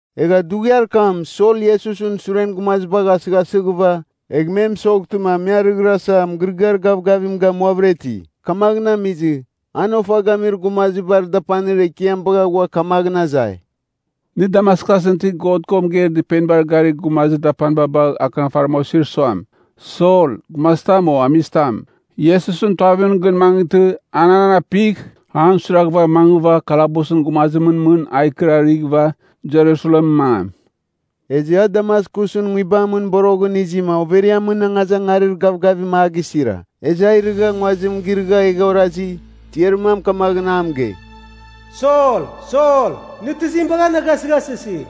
Egha dughiar kam Sol Iesusɨn suren gumazibagh asɨghasɨghɨva, egh me mɨsoghtɨma me arɨghirasa, mɨgɨrɨgɨar gavgavim gamuavɨra iti. Kamaghɨn amizɨ, an ofa gamir gumazibar dapanir ekiam bagha ghua kamaghɨn azai, “Nɨ Damaskusɨn itir God ko mɨgeir dɨpenibar garir gumazir dapaniba bagh akɨnafariba osir suam, ‘Sol, gumazitam o amizitam, Iesusɨn Tuavimɨn gɨn mangɨtɨ, an an apigh, an suiraghɨva mangɨva kalabusɨn gumazimɨn mɨn a ikɨrarighɨva, Jerusalemɨn mangam.’” Ezɨ a Damaskusɨn nguibamɨn boroghɨn izima overiamɨn angazangarir gavgavim a gisira. Ezɨ a irɨgha nguazim girɨgha egha orazi, tiarir mam kamaghɨn a mɨgei, “Sol, Sol, nɨ tizim bagha na gasɨghasɨsi?”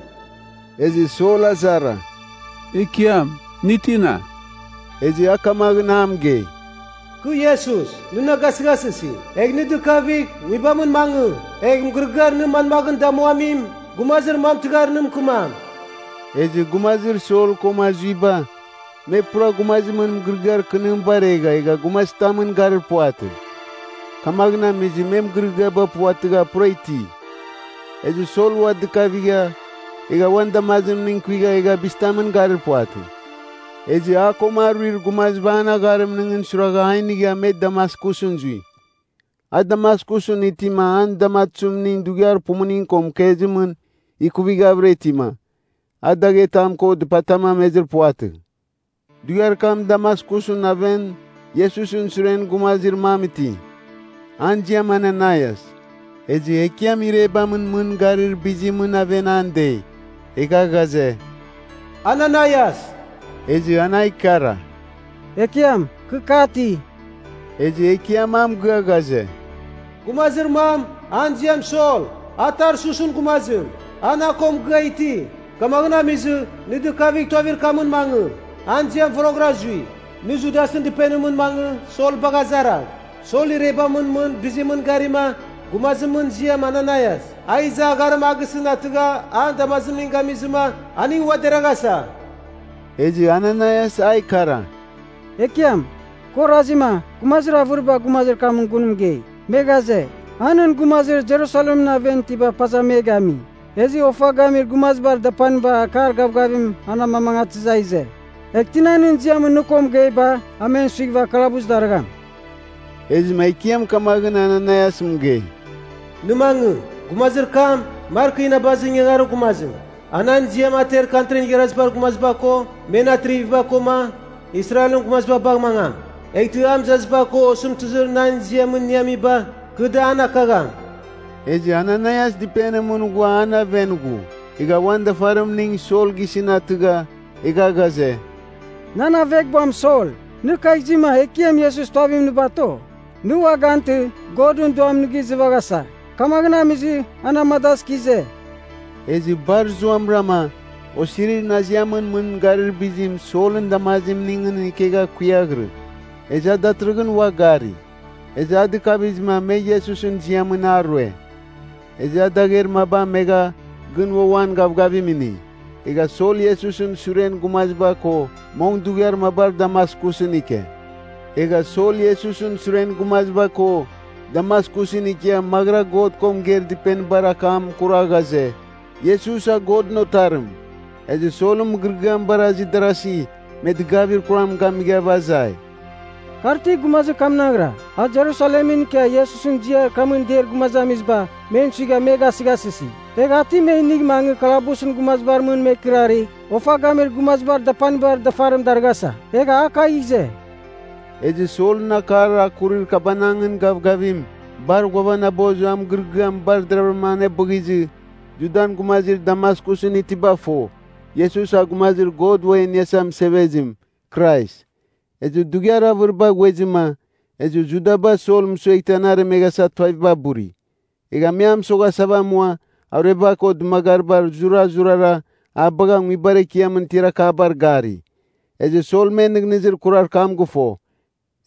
Ezɨ Sol azara, “Ekiam, nɨ tina?” Ezɨ a kamaghɨn a mɨgei, “Kɨ Iesus, nɨ na gasɨghasɨsi. Egh nɨ dɨkavigh, nguibamɨn mangɨ. Egh mɨgɨrɨgɨar nɨ manmaghɨn damuamim, gumazir mam tɨghar nɨ mɨkɨmam.” Ezɨ gumazir Sol koma zuiba, me pura gumazimɨn mɨgɨrɨgɨar kɨnim baregha egha gumazitamɨn garir puvatɨ. Kamaghɨn amizɨ me mɨgɨrɨgɨaba puvatɨgha pura iti. Ezɨ Sol ua dɨkavigha, egha uan damazimning kuigha, egha a bizitamɨn garir puvatɨ. Ezɨ a koma aruir gumaziba an agharimningɨn suiragha a inigha me Damaskusɨn zui. A Damaskusɨn itima an damatuzimning dughiar pumuning ko mɨkezimɨn ikuvighavɨra itima, a daghetam ko dɨpatam amezir puvatɨ. Dughiar kam Damaskusɨn aven Iesusɨn suren gumazir mam iti, an ziam Ananaias. Ezɨ Ekiam irebamɨn mɨn bizimɨn garimɨn aven an dei, egha ghaze, “Ananaias!” Ezɨ an a ikara, “Ekiam, kɨ kati.” Ezɨ Ekiam a mɨgɨa ghaze, “Gumazir mam, an ziam Sol, a Tarsusɨn gumazim. A na ko mɨgɨa iti. Kamaghɨn amizɨ, nɨ dɨkavigh, tuavir kam mangɨ, an ziam Voroghɨra Zui. Nɨ Judasɨn dɨpenimɨn mangɨ Sol bagh azaragh. Sol irebamɨn mɨn bizimɨn garima, gumazimɨn ziam Ananaias, a iza agharim a gisɨn atɨgha an damazimning gamizɨma, aning ua deraghasa.” Ezɨ Ananaias a ikara, “Ekiam, kɨ orazima, gumazir avɨriba gumazir kamɨn gun mɨgei, me ghaze, a nɨn gumazir Jerusalemɨn aven itiba paza me gami. Ezɨ ofa gamir gumazibar dapaniba akar gavgavim an amamangatɨzɨ a ize. Egh tina nɨn ziamɨn nɨ ko mɨgeiba, a men suighɨva kalabus darɨgham.” Ezɨma Ekiam kamaghɨn Ananaias mɨgei, “Nɨ mangɨ! Gumazir kam, mar kɨ inabazir ingangarir gumazim. A nan ziam ater Kantrin Igharazibar Gumaziba ko men atriviba koma Israelɨn gumaziba bagh mangam. Eghtɨ a mɨzaziba ko osɨmtɨzir nan ziamɨn iniamiba, kɨ da an akagham.” Ezɨ Ananaias dɨpenimɨn ghua an aven ghu. Egha uan dafarimning Sol gisɨn atɨgha, egha ghaze, “Nan aveghbuam, Sol, nɨ kagh izima Ekiam Iesus tuavimɨn nɨ bato. Nɨ ua gantɨ, Godɨn Duam nɨ gizɨvaghasa, kamaghɨn amizɨ a na amadazɨ kɨ ize.” Ezɨ bar zuamɨrama, osirir naziamɨn mɨn garir bizim Solɨn damazimningɨn ikegha kuiaghirɨ. Ezɨ a datɨrɨghɨn ua gari. Ezɨ a dɨkavizɨma me Iesusɨn ziamɨn a rue. Ezɨ a dagher maba amegha gɨn ua uan gavgavim ini. Egha Sol Iesusɨn suren gumaziba ko mong dughiar mabar Damaskusɨn ike. Egha Sol Iesusɨn suren gumaziba ko Damaskusɨn ikia maghɨra God ko mɨgeir dɨpenibar akam kura ghaze, Iesus a Godɨn Otarim. Ezɨ Solɨn mɨgɨrɨgɨam baraghizɨ darasi, me dɨgavir kuram gamighava azai, “Kar ti gumazir kamnaghra, a Jerusalemɨn ikia Iesusɨn ziar kamɨn deir gumazamiziba, men suigha me gasɨghasɨsi? Egh a ti me inigh mangɨ kalabusɨn gumazibar mɨn me ikɨrarɨgh ofa gamir gumazibar dapanibar dafarim darɨghasa, egha a kagh ize?” Ezɨ Solɨn akar a kuri kabanangɨn gavgavim bar ghuanabozɨ a mɨgɨrɨgɨam bar deravɨrama anebɨghizɨ, Judan gumazir Damaskusɨn itiba fo, Iesus a Gumazir God Uam E Iniasa Mɨsevezim, Krais. Ezɨ dughiar avɨriba ghuezɨma, ezɨ Judaba Sol mɨsueghtɨ an aremeghasa tuaviba buri. Egha me a mɨsoghasava amua arueba ko dɨmagariba zurazurara a bagha nguibar ekiamɨn tiar akabar gari, ezɨ Sol men nɨghnɨzir kurar kam gɨfo.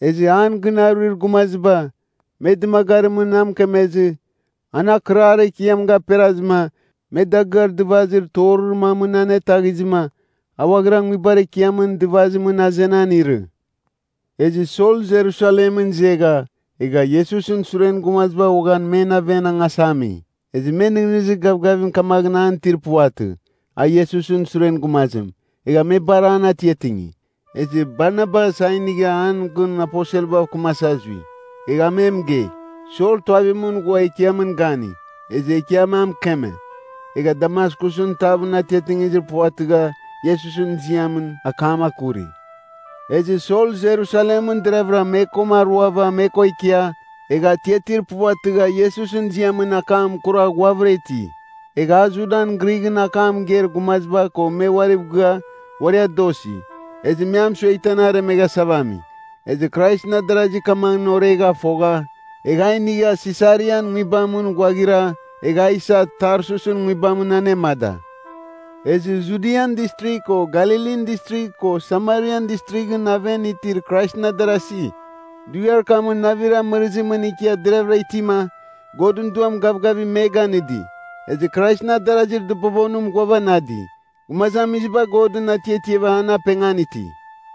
Ezɨ an gɨn aruir gumaziba, me dɨmagarimɨn a mɨkemezɨ an akɨrar ekiam gaperazɨma, me dagɨar dɨvazir torir mamɨn anetaghizɨma a ghuaghira nguibar ekiamɨn dɨvazimɨn azenan irɨ. Ezɨ Sol Jerusalemɨn izegha, egha Iesusɨn suren gumaziba uaghan men aven angasa ami. Ezɨ me nɨghnɨzir gavgavim kamaghɨn an itir puvatɨ, a Iesusɨn suren gumazim, egha me bar an atiatingi. Ezɨ Barnabas a inigha an gun aposelbav kɨmasa zui. Egha a me mɨgei, Sol tuavimɨn ghua Ekiamɨn gani. Ezɨ Ekiam a mɨkeme, egha Damaskusɨn tavɨn atiatingizir puvatɨgha, Iesusɨn ziamɨn akam akuri. Ezɨ Sol Jerusalemɨn deravɨra me koma aruava me ko ikia, egha atiatir puvatɨgha Iesusɨn ziamɨn akam kura ghuavɨra iti. Egha a Judan Grighɨn akam mɨgeir gumaziba ko me uariv gɨa uari adosi, ezɨ me a mɨsueghtɨ an aremeghasava ami. Ezɨ Kraisɨn adarasi kamaghɨn oregha fogha, egha a inigha Sesarian nguibamɨn ghuaghira, egha a isa Tarsusɨn nguibamɨn anemada. Ezɨ Judian Distrigh ko Galilin Distrigh ko Samarian Distrighɨn aven itir Kraisɨn adarasi, dughiar kamɨn navir amɨrɨzimɨn ikia deravɨra itima, Godɨn Duam gavgavim me ganɨdi. Ezɨ Kraisɨn adarazir dɨbobonim ghuavanadi. Gumazamiziba Godɨn atiatiava an apengan iti.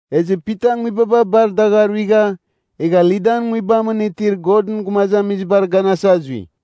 Ezɨ Pita nguibaba bar dagh aruigha, egha Lidan nguibamɨn itir Godɨn gumazamizibar ganasa zui.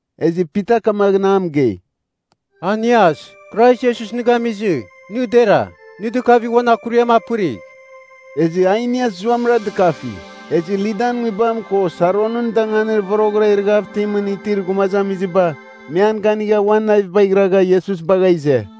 Ezɨ Pita kamaghɨn a mɨgei, “Ainias, Krais Iesus nɨ gamizɨ, nɨ dera. Nɨ dɨkavigh uan akuriam apɨrigh.” Ezɨ Ainias zuamɨra dɨkafi. Ezɨ Lidan nguibam ko Saronɨn danganir voroghɨra irɨghav itimɨn itir gumazamiziba, me an ganigha uan navibagh iragha Iesus bagha ize.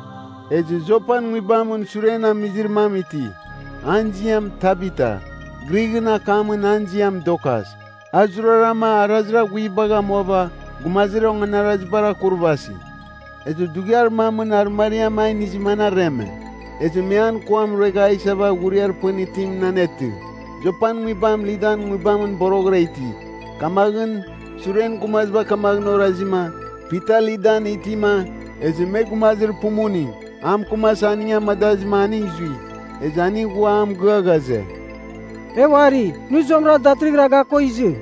Ezɨ Jopan nguibamɨn suren amizir mam iti, an ziam Tabita, Grighɨn akamɨn an ziam Dorkas, a zurarama arazir aghuibagh amuava gumazir onganaraziba akurvasi. Ezɨ dughiar mamɨn arɨmariam a inizɨma an areme. Ezɨ me an kuam ruegha a isava ghuriar pɨn itimɨn anetɨ. Jopan nguibam Lidan nguibam boroghɨra iti, kamaghɨn suren gumaziba kamaghɨn orazima, Pita Lidan itima, ezɨ me gumazir pumuning a mɨkɨmasa aning amadazɨma aning zui. Ezɨ aning ghua a mɨgɨa ghaze, “E uari, nɨ zuamɨra datɨrɨghɨra ga ko izɨ!”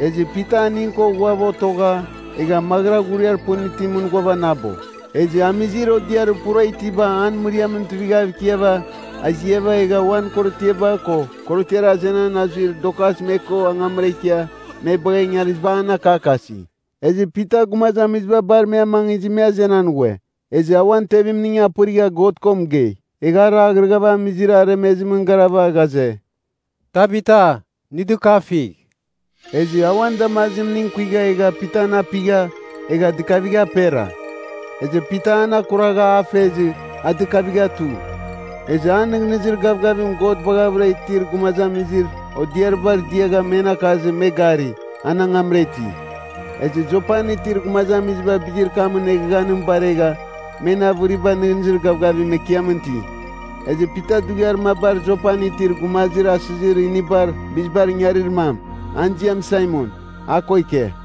Ezɨ Pita aning ko ghuava otogha egha maghɨra ghuriar pɨn itimɨn ghuavanabo. Ezɨ amizir odiarir pura itiba an mɨriamɨn tuivighav ikiava, aziava egha uan korotiaba ko korotiar azenan azuir Dorkas me ko angamra ikia me bagha ingariziba an akakasi. Ezɨ Pita gumazamiziba bar me amangizɨ me azenan ghue. Ezɨ a uan tevimning apɨrigha God ko mɨgei. Egha a raghrɨghava amizir aremezim garava ghaze, “Tabita, nɨ dɨkafigh.” Ezɨ a uan damazimning kuigha egha Pitan apigha, egha dɨkavigha apera. Ezɨ Pita an akuragha a fezɨ a dɨkavigha tu. Ezɨ a nɨghnɨzir gavgavim God baghavɨra itir gumazamizir odiaribar diagha men akazɨ me gari, an angamra iti. Ezɨ Jopan itir gumazamiziba bizir kamɨn eghaghanim baregha men avɨriba nɨghnɨzir gavgavim Ekiamɨn iti. Ezɨ Pita dughiar mabar Jopan itir gumazir asɨzir inibar bizibar ingarir mam, an ziam Saimon, a ko ike.